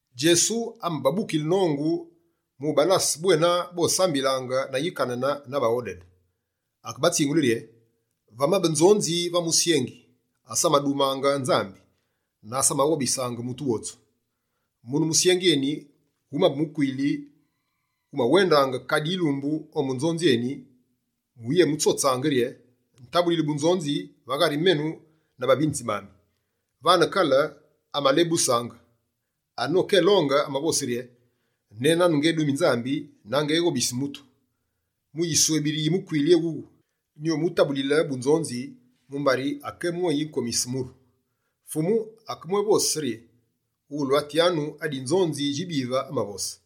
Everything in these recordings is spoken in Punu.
Djesu amababukile nongu mu ubalase bwena bosambilaange na yikanane na baghodede. Akebatsingule rye: «Vamabe nzonzi va musyengi, asamadumange Nzambi na asamaghobisaange mutu wotsu. Mune musyengi eni, wumabe mukwili wumawendaange kadi yilumbu ombu nzonzi eni mu uyemutsotsaange rye: “Tabulili bunzonzi va ghari menu na bavinitsi bami.” Vane kale, amalebusaange. Anokelonge, amavose rye: “Nénane ngédumi Nzambi na ngeghobisi mutu, mu yiswebiri yi mukwili ewune, nyumutabulile bunzonzi mumbari akébwéyikomise muru.”» Fumu akebwévose rye: «Ghulwatyanu adi nzonzi djibive amavose!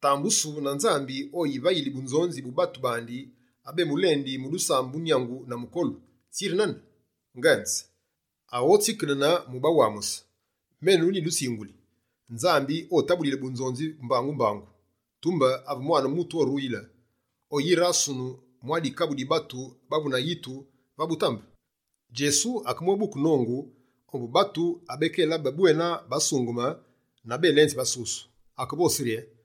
Tambusu na Nzambi, ovayile bunzonzi mu batu bandi abemulendi mu dusambu nyangu na mukolu! Tsiri nane? Ngenze, aghotsikedene mu ubawamuse. Menu, nyidutsinguli, Nzambi obatabulile bunzonzi mbangu-mbangu. Tumbe ave Mwane Mutu oruyile, oyirasunu mwa dikabu di batu bavu na yitu va butambe?» Djesu akemwébuke nongu ombu batu abekélabe bwena basungeme na belenzi basusu, akevose rye: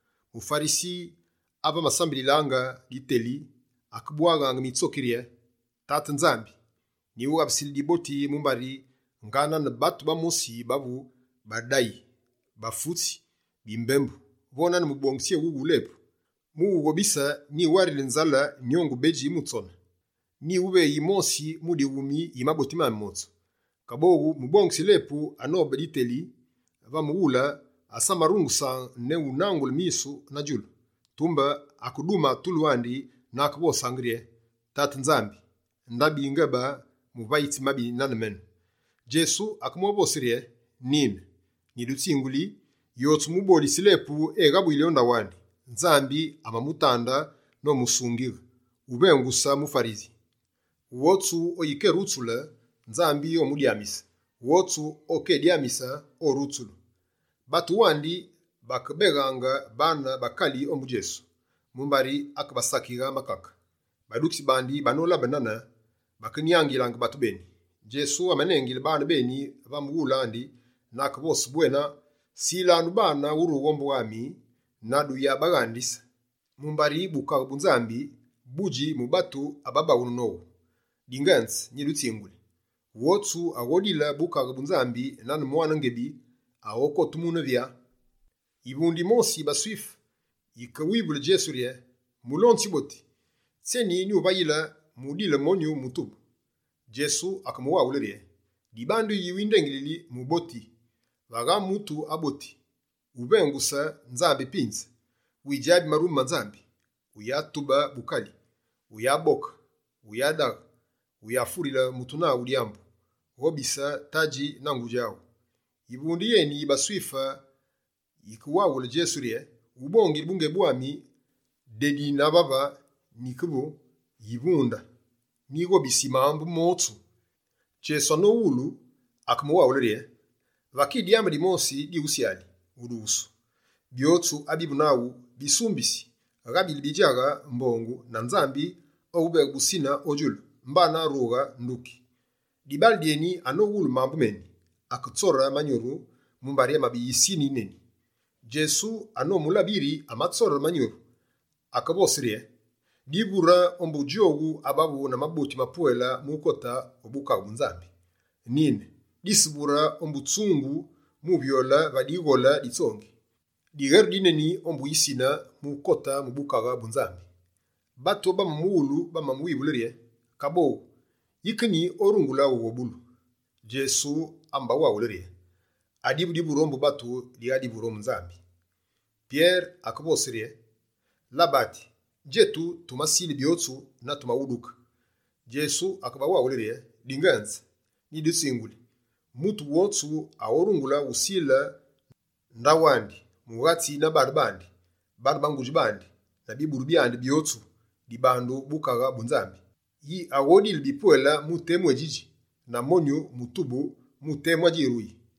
MuFarisi, ave amasambililaange diteli, akebwaghaange mitsoki rye: “Tate Nzambi, nyiwughabusili diboti mumbari ngaa nane batu bamosi bavu badayi, bafutsi, bimbembu, vo nane mubolitsi éwuwu wu lepu. Mu uwughobise, nyiwarili nzale nyongu bedji mu tsone, nyiwuveyingi yimosi mu dighumi yi maboti mami motsu.” Kaboghu mubolitsi lepu anobe diteli, va mughule, asamarungusaange ne unangule misu na djulu, tumbe akedumange tulu andi na akevosaange rye: “Tate Nzambi ndabi ngebe muvayitsi mabi nane menu.”» Djesu akemwévose rye: «Nine, nyidutsinguli, yotsu mubolitsi lepu eghabuyili o ndaghu andi, Nzambi amamutande nomusungighe, wuvenguse muFarisi. Wotsu oyikerutsule, Nzambi omudyamise. Wotsu okedyamise, orutsulu.» Batu wandi bakebeghange baane bakali ombu Djesu mumbari akebasakighaange makake. Badukitsi bandi, banolabe nane, bakenyangilaange batu beni. Djesu amanengile baane beni va mughule andi na akevose bwena: «Silanu baane urughe ombu ami na duyabaghandise, mumbari Bukaghe bu Nzambi, budji mu batu ababaghunu nowu. Dingenze nyidutsinguli, wotsu aghodile Bukaghe bu Nzambi nane mwane ngebi, aghokote wune “vyaa”.» Yivunde yimosi yi baSwife, yike wivule Djesu rye: «Mulonzi wuboti, tsyeni nyuvayile mu udile monyu mutubu?» Djesu akemuwaghule rye: «Dibandu yi windengilili “Muboti”? Vagha mutu aboti, wuvengutse Nzambi pinze. Widjabi marume ma Nzambi: “Wuyatube bukali, wuyaboke, wuyadaghe, wuyafurile mutu naghu dyambu. Ghobise tadji na ngudji aghu.”» Yivunde yeni yi baSwife yikewaghule Djesu rye: «Ubongile bungebi bwami, dedi na vave nyikevu yivunde, nyighobisi mambu motsu.» Djesu anomuwulu, akemuwaghule rye: «Vaki dyambu dimosi diwusyali udughusu: byotsu abivu naghu, bisumbisi, ghaabile bidjaghe mbongu na Nzambi owuveghe busine o djulu, mbana rughe, nduki.» Dibaale dyeni, anowulu mambu meni, aketsore manyuru, mumbari amabe yisine yineni. Djesu, anomulabe yiri amatsore manyuru, akevose rye: «Divure ombu djowu abavu na maboti mapwele mu ukote o Bukaghe bu Nzambi! Nine, disavure ombu tsungu mu uvyoyile va dighole di tsongi dighole di tsongi: dilute di tsongi.; diweru dineni ombu yisine mu ukote mu Bukaghe bu Nzambi.» Batu abamamuwulu, bamamuwivule rye: «Kaboghu, yike nyi, orungulu ughobulu?» Djesu amabawaghule rye: «Adivu divure ombu batu, dighaa divure ombu Nzambi.» Pyere akevose rye: «Labati, djetu, tumasile byotsu na tumawuduke.» Djesu akebawaghule rye: «Dingenze, nyidutsinguli, mutu wotsu, aghorungule usile ndaghu andi, mughatsi na baane bandi, baane ba ngudji bandi na biburu byandi byotsu dibandu Bukaghe bu Nzambi, yi aghodile bipwele mu temu édjidji, na monyu mutubu mu temu adjiruyi.»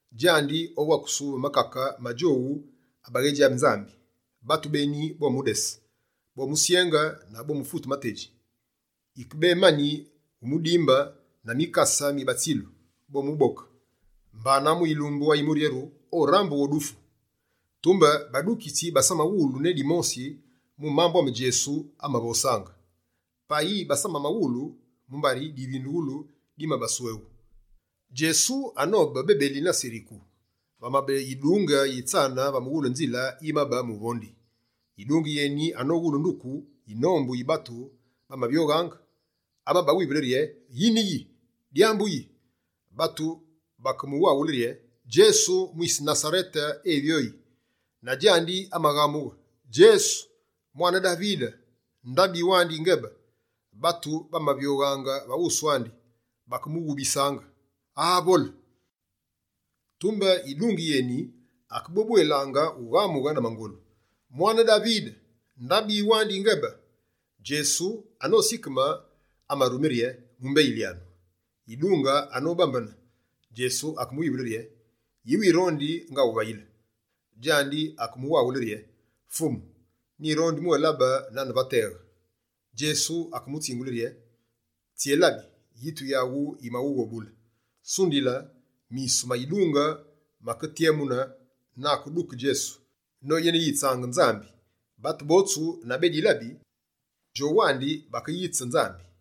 Djandi, owakusu va makake ma djowu abaghédjabi Nzambi. Batu beni, bomudese, bomusyenge na bomufute matedji. Yikebemani wumudimbe na mikase mi batsilu, bomuboke. Mbana, mu yilumbu ayimuryeru, orambughe o dufu.» Tumbe badukitsi basamawulu ne dimosi mu mambu ame Djesu amavosaange. Payi basamawulu, mumbari divindughulu dimabasweghu. Djesu anobe bebeli na Seriku, vamabe yidunge yitsane va mughulu nzile yimabe muvondi. Yidunge yeni anowulu nduku yinombu yi batu bamavyoghaange, amabawivule rye: «Yine yi? Dyambu yi?» Batu bakemuwaghule rye: «Djesu mwise Nasarete evyoyi.» Na djandi amaghamughe: «Djesu, mwane Davide, ndabi wandi yingebe!» Batu abamavyoghaange va wusu andi, bakemughubisaange: Aa vole! Tumbe yidunge yeni akebwébwelaange ughamughe na mangolu: «Mwane Davide, ndabi wandi yingebe.» Djesu, anosikeme, amarume rye: «Mumbeyilyanu.» Yidunge anobambene, Djesu akemuwivule rye: «Yi wirondi ngawuvayile?» Djandi akemuwaghule rye: «Fumu, nyirondi ubwélabe nane va teghe.» Djesu akemutsingule rye: «Tsyélabi! Yitu yaghu yimaghughobule.» Sundila, misu ma yidunge make tyemune, na akeduke Djesu noyeneyitsange Nzambi. Batu botsu na bédilabi, djowandi bakeyitse Nzambi.